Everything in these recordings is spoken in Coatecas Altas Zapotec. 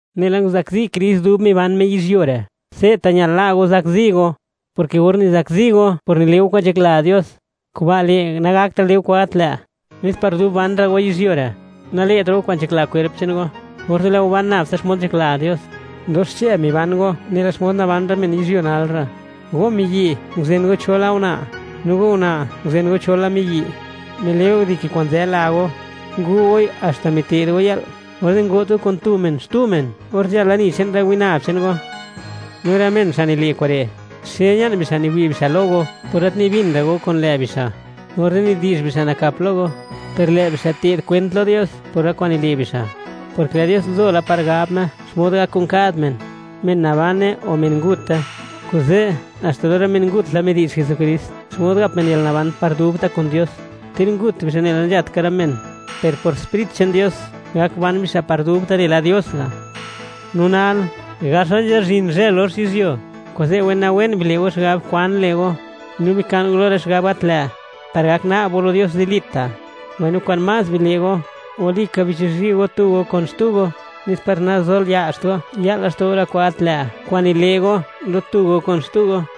Nela nguzakzi Krist dub miban Me yizhyuo re', se'ta' ñal la' go zakzi go, porke or nizakzi go por nile' go kwa'n nzhakla Dios, kuba' le', nagaklatra' go le' go kwa'n gat lë', nes par dub ban ra' go yizhyuo re', nale'tra' go kwa'n nzhakla kwerp che'n go, orze' lë' go ban nab tsa xmod nzhakla Dios. Dox xche miban go nela xmod naban rë men yizhyuo nal re'; go miyi' nguzen go cho la una'; no go una' nguzen go cho la miyi', mile' go dike kwa'n nzë la go, ngu' goi haxta mite'd go yë'l, orze' ngo't go kun tu men xtu men or nzhal lani che'n rë winab che'n go. No rë men, xa' nile' kure', xe ña'n bixa' niwi' bixa' lo go por gat nibin ra' go kun lë' bixa', orze' nidi'zh bixa' nakap lo go. Per lë bixa' te'd kwent lo Dios por rë kwa'n nile' bixa', porke lë' Dios nzo la par gab Me xmod gak kun kad men, men nabane o men ngute. Kuze' haxta lo rë men ngut la midi'zh Jesukrist xmod gap men yalnaban par dubta' kun Dios. Ter ngut bixa' nela nzhat ka rë men, per por Sprit che'n Dios, gak ban bixa' par dubta' nela Dios ga'. No nal, gax la nzhazhin zhë lox yizhyuo; kuze' wenawen bile' go xigab kwan le' go, no bika'n go lo rë xigab gat lë', par gak na'b go lo Dios zilita'. Mbaino kwa'n más bile' go, walika bichizhi' go tu go kun xtu go, nes par nazolia'zht go (le't go naya') ya'l laxto' go rë kwa'n gat lë't kwa'n nile' go lo tu go kun xtu go.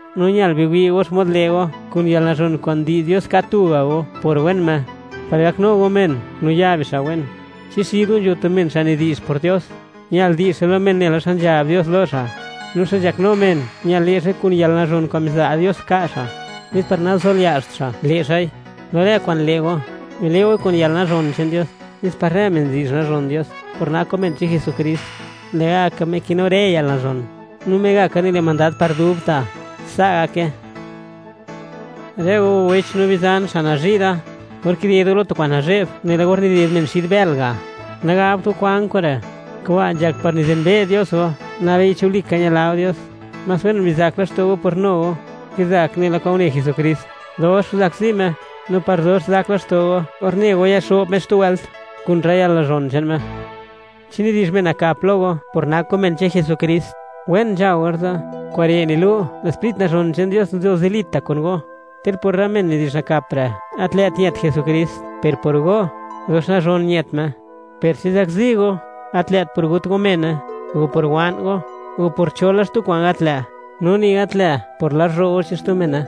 No ñal wi' go xmod le' go kun yalnazhon kwa'n ndi'z Dios ka' tuga' go por wen Me, par gaknu go men no ya bixa' wen. Chi xid go nzho tu men xa' nidi'zh por Dios, ñal di'zh xa' lo men nela xa nzhab Dios lo xa'; no xa' nzhaknu men, ñal le' xa'i kun yalnazhon kwa'n miza' Dios ka' xa', nes par nazolia'zht xa' le' xa'i. Lo rë kwa'n le' go, bile' goi kun yalnazhon che'n Dios, nes par rë men di'zh nazhon Dios por nak go men che'n Jesukrist. Lë'gaka Me kinu rë yalnazhon, no Megaka nile' mandad par dubta'. Sa' gake. Rë go wech no bizan xa' nazhi' da, or kided go lo tu kwa'n nazhe'b nela or nided men xid bël ga', nagabt go: “¿Kwan kure'?” Kuba' nzhak par nizenbe' Dios go (niwi' Dios xmod nak go), nabei chi walika ñila go Dios. Más wen bizak laxto' go por nu go, kizak nela kwa'n une Jesukrist, dox nguzakzi Me; no par dox zak laxto' go or ne go yaxo'b Me xtu wëlt, kun rë yalnazhon che'n Me. Chi nidi'zh men nakap lo go por nak go men che'n Jesukrist, wen nzha go orze'; kure' nilu', lë' Sprit nazhon che'n Dios nzo zilita' kun go. Ter por rë men nidi'zh nakap re', gat lë't ñët Jesukrist, per por go, dox nazhon ñët Me. Per chi zakzi go, gat lë't por gut go mene, o por wa'n go, o por cho la xtu kwa'n gat lë', no ni gat lë' por lazhro' go (metich go) che'n xtu mene.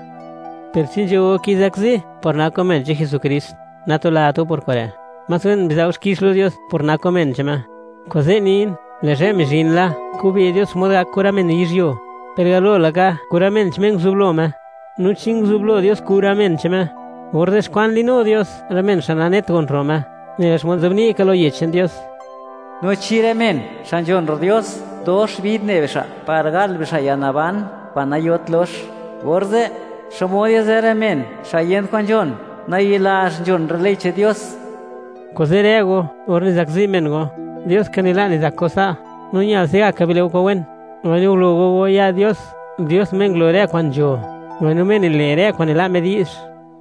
Per chi nzho go kizakzi por nak go men che'n Jesukrist, natulat go por kure'; más wen biza' go xkix lo Dios por nak go men che'n Me. Kuze' nin, lë' zhë mizhin la, kube' Dios xmod gak kun rë men yizhyuo, per galo laka kun rë men che'n Me nguzublo Me. No chi nguzublo Dios kun rë men che'n Me, orze', ¿xkwan li'nu Dios rë men xa' nanet gon ro' Me? Nela xmod nzobni' ka lo Yech che'n Dios: No chi rë men xa' nzhon ro' Dios, dox bid ne bixa' par gal bixa' yalnaban kwa'n nayot lox. Orze', ¿xmod yazë rë men xa' yent kwan nzhon, nayi'lazh nzhon rë ley che'n Dios? Kuze', rë go, or nizakzi men go, Dios ka nila' nizak go sa'; no ñal se'gaka bile' go kwa'n wen, mbaino gulo go go ya' Dios, Dios Me ngulo rë kwa'n nzho, mbaino Me nile' rë kwa'n nila' Me di'zh.